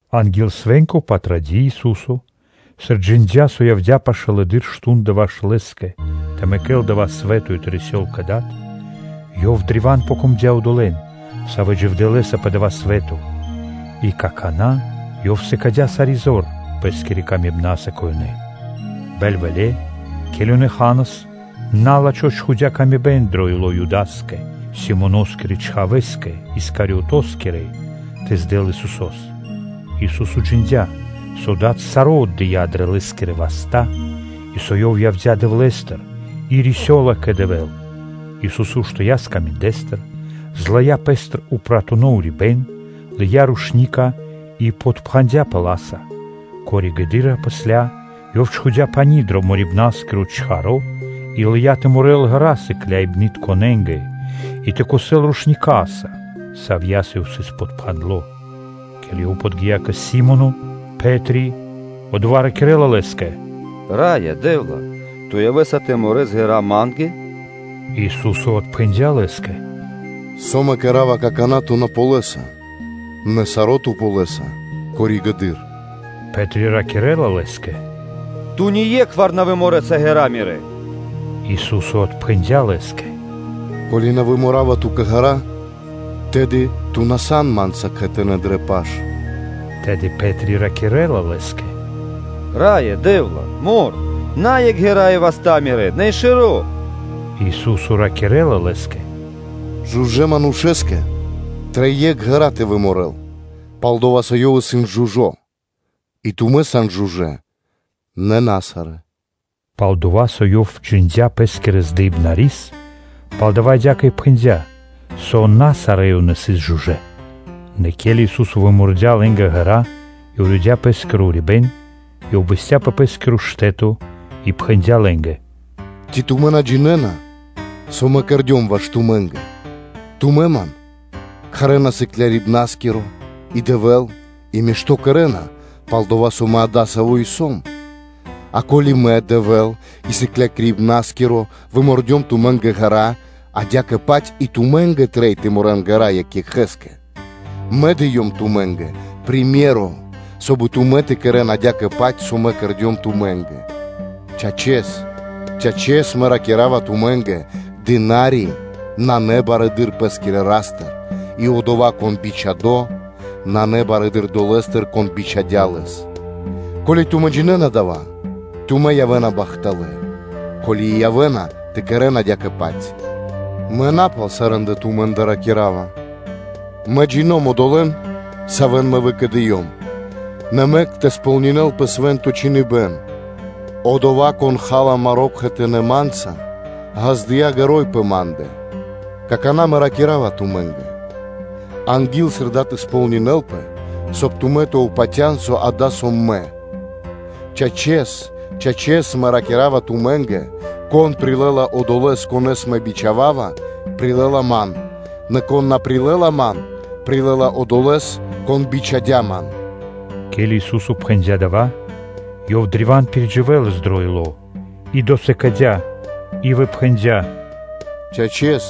Анги́л свэ́нко Патради́ Ису́со, сыр джиндя́, со явдя́ пашылэды́р мардо́ (шту́нда) ваш Лэ́скэ тэ мэкэл дава́ свэ́то и тэ рисёл кэ Дад, Лэ́скэ ячнэ́ древа́н дро́га одолэ́, савэ́ дживдэ́ Лэ́са пэ дава́ свэ́то, и какана́ Ёв сыкадя́ сари́ зор Пэ́скирэ ласкаса кэ ёнэ. Бэльвэле́, ке́ли ёнэ ханас, на́лачхо чхудя́ мысля дро ило́ Юда́скэ, Симоноскирэ чхавэ́скэ Искариотоскирэскэ тэ здэл Исусо́с. Ису́со джиндя́, со Дад саро́ отдыя́ дрэ Лэ́скирэ васта́, и со Ёв явдя́ Дэвлэ́стыр и рисёла кэ Дэвэ́л. Ису́со уштыя́ скаминдэстыр, злыя́ Пэ́стыр упратуно урибэ́н, лыя́ рушника (кхосно) и подпхандяпэ ла́са. Пало́ (после) Ёв чхудя́ пани́ дро морибнаскиро чаро́ и лыя́ тэ морэл ґэра́ сыкляибнытконэ́нгэ и тэ кхосэл рушникаса, савья́са Ёв сыс подпхандло. Ке́ли Ёв подги́я кэ Си́моно Пэ́три, одова́ ракирэ́ла Лэ́скэ: “Раё Дэ́вла! Ту явэ́са тэ морэс ґэра́ ма́нгэ? Ису́со отпхэндя́ лэ́скэ: “Со Мэ кэра́ва, какана́ ту на ґалёса, нэ саро́ ту ґалёса коригэды́р.” Пэ́три ракирэ́ла Лэ́скэ: “Ту ние́кхвар на выморэса ґэра́ мирэ́.” Ису́со отпхэндя́ лэ́скэ: “Ко́ли Мэ на выморава ту́кэ ґэра́, тэды ту на сан Ма́нца кхэтанэ́ дрэ паш.” Тэды Пэ́три ракирэ́ла Лэ́скэ: “Раё Дэ́вла! Мор, на екх ґэра́ и васта́ мирэ́, нэ и шэро́.” Ису́со ракирэ́ла Лэ́скэ: “Жужэ́ (чыстонэ) манушэ́скэ трэй екх ґэра́ тэ выморэл, пал-дова́ со ёв исын жужо́; и тумэ́ сан жужэ́, нэ на сарэ́. Пал-дова́ со Ёв джиндя́ Пэ́скирэс здыибнарис, палдава́ адя́кэ и пхэндя́, со на сарэ́ ёнэ сыс жужэ́. Нэ ке́ли Ису́со вымордя лэ́нгэ ґэра́ и уридя Пэ́скиро урибэ́н, Ёв бэсця́ пэ Пэ́скиро штэ́то и пхэндя́ лэ́нгэ: “Ци тумэ́ на джинэ́на, со Мэ кэрдём ваш тумэ́нгэ? Тумэ́ Ман кхарэ́на “Сыклякирибна́скиро” и “Дэвэ́л”, и мишто́ кэрэ́на, пал-дова́ со Мэ адасаво́ и Сом. И ко́ли Мэ, Дэвэ́л и Сыклякирибна́скиро вымордём тумэ́нгэ ґэра́, адя́кэ-паць и тумэ́нгэ трэй тэ морэн ґэра́ екх екхэ́скэ. Мэ дыём тумэ́нгэ приме́ро (сыкаибэ́н), соб (кай) и тумэ́ тэ кэрэ́н адя́кэ-паць, со Мэ кэрдём тумэ́нгэ. Чачэс, чачэс Мэ ракира́ва тумэ́нгэ: дына́ри исын на барэды́р пэ́скирэ Ра́стыр, и одова́, кон бичхадо́, нанэ барэды́р одолэ́стыр, Кон бичхадя́ лэс. Ко́ли тумэ́ джинэ́на дава́, тумэ́ явэ́на бахталэ́, ко́ли и явэ́на тэ кэрэ́н адя́кэ-паць. Мэ на пал сарэ́ндэ тумэ́нгэ ракира́ва. Мэ джино́м (джина́в) одолэ́н, савэ́н Мэ выкэдыём; нэ мэк тэ сполнинэ́лпэ Свэ́нто Чхиныбэ́н: Одова́, кон ха́ла маро́ кхэтанэ́ Ма́нца, ґаздыя́ ґэро́й пэ Ма́ндэ. Какана́ Мэ ракира́ва тумэ́нгэ: анги́л, сыр дава́ сполнинэлапэ, соб (кай) тумэ́ тэ патя́н, со дава́ сом Мэ. Чачэс, чачэс Мэ ракира́ва тумэ́нгэ: кон прилэ́ла одолэ́с, конэ́с Мэ бичхава́ва, прилэ́ла Ман; нэ кон прилэ́ла Ман, прилэ́ла Одолэ́с, Кон бичхадя́ Ман.” Ке́ли Ису́со пхэндя́ дава́, Ёв древа́н пиридживэлас дро ило́ и досыкадя и выпхэндя: “Чачэс,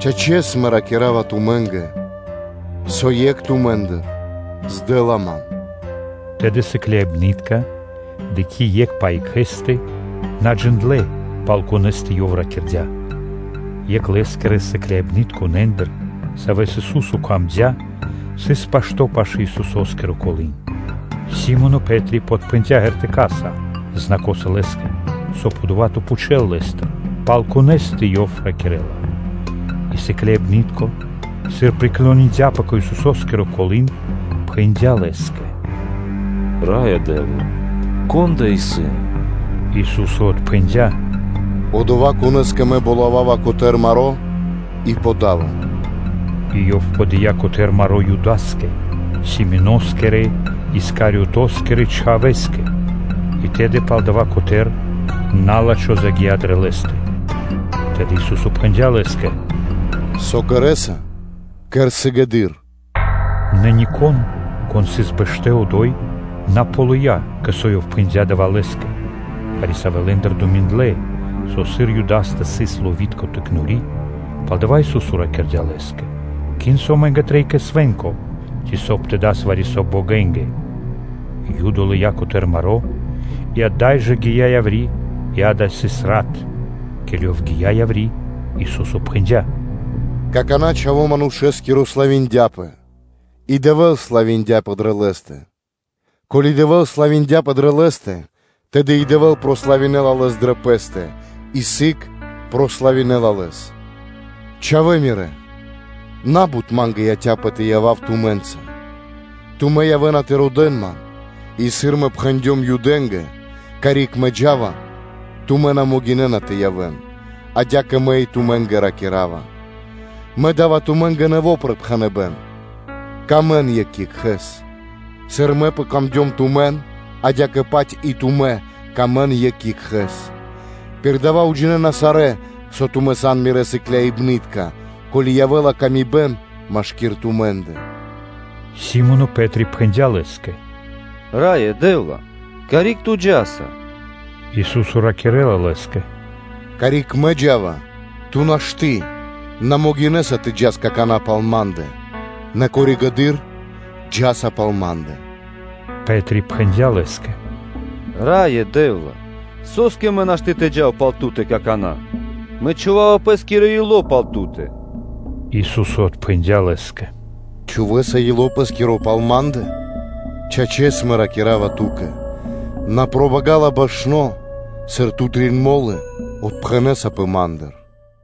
чачэс Мэ ракира́ва тумэ́нгэ, со екх тумэ́ндыр здэла Ман.” Тэды сыкляибны́тка, дыкхи́ екх пэ екхэ́стэ, на джиндлэ́, пал конэ́стэ Ёв ракирдя́. Екх Лэ́скирэ сыкляибнытконэндыр, саво́ сыс дро́го Исусо́скэ, сыс пашто́ пашы́л Исусо́скиро колы́н. Си́моно Пэ́три подпхэндя шпэра́са (знакоса) лэ́скэ, соб (кай) одова́ тэ пхучэл Лэ́стыр, пал конэ́стэ Ёв ракирэ́ла. И сыкляибны́тко, сыр приклониндяпэ кэ Исусо́скиро колы́н, пхэндя́ Лэ́скэ: “Раё Дэ́вла! Кон адава́ исын?” Ису́со отпхэндя́: “Одова́, конэ́скэ Мэ болавава котэ́р маро́ и подава”, и Ёв подыя котэ́р маро́ Юда́скэ, Симоноскирэ-Искариотоскирэ чхавэ́скэ. И тэды пало́ дава́ котэ́р, на́лачхо загия́ дрэ лэ́стэ. Тэды Ису́со пхэндя́ лэ́скэ: “Со кэрэ́са, кэр сыгэды́р.” Нэ нико́н, кон сыс бэшто́ одо́й, на ґалыя́, кэ со Ёв пхэндя́ дава́ лэ́скэ. Вари-савэ́ лэ́ндыр думиндлэ, со, сыр Юдастэ сыс ловитко тыкнори, палдава́ Ису́со ракирдя́ лэ́скэ: “Кин, со амэ́нгэ трэй кэ свэ́нко, ци соб (кай) тэ дас вари-со богэнгэ.” Юда лыя́ котэ́р маро́, и ада́й жэ гия́ яври́; и дава́ сыс рат. Ке́ли ёв гия́, Ису́со пхэндя́: “Какана́ Чхаво́ Манушэ́скиро славиндяпэ и Дэвэ́л славиндяпэ дрэ Лэ́стэ. Ко́ли Дэвэ́л славиндяпэ дрэ Лэ́стэ, тэды и Дэвэ́л прославинэла Лэс дрэ Пэ́стэ, и сыг прославинэла Лэс. Чхавалэ Мирэ́! На́бут Ма́нгэ яця́пэ тэ явав тумэ́нца. Тумэ́ явэ́на тэ родэ́н Ман, и сыр Мэ пхэндём Юдэ́нгэ: Карик Мэ джа́ва, тумэ́ на могинэ́на тэ явэ́н, адя́кэ Мэ и тумэ́нгэ ракира́ва. Мэ да́ва тумэ́нгэ нэво́ припхэныбэ́н: явэ́н дро́га екх ваш екхэ́скэ; сыр Ма́нгэ, адя́кэ-паць и тумэ́ явэ́н дро́га екх ваш екхэ́скэ. Пир дава́ уджинэна сарэ́, со тумэ́ сан Мирэ́ сыкляибны́тка, ко́ли явэ́ла ла́ска машки́р тумэ́ндэ.” Си́моно Пэ́три пхэндя́ Лэ́скэ: “Раё Дэ́вла! Карик Ту джа́са?” Ису́со ракирэ́ла лэ́скэ: “Карик Мэ джа́ва, ту́кэ нашты́ (на могинэ́са) тэ джас какана́ пал Ма́ндэ, нэ коригэды́р джа́са пал Ма́ндэ.” Пэ́три пхэндя́ Лэ́скэ: “Раё Дэ́вла! Со́скэ Ма́нгэ нашты́ тэ джав пал Ту́тэ какана́? Мэ чхува́ва пэ́скиро ило́ пал Ту́тэ.” Ису́со отпхэндя́ лэ́скэ: “Чхувэ́са ило́ пэ́скиро пал Ма́ндэ? Чачэс, чачэс Мэ ракира́ва ту́кэ: на пробагала башно, сыр ту трин мо́лы отпхэнэсапэ Ма́ндыр.”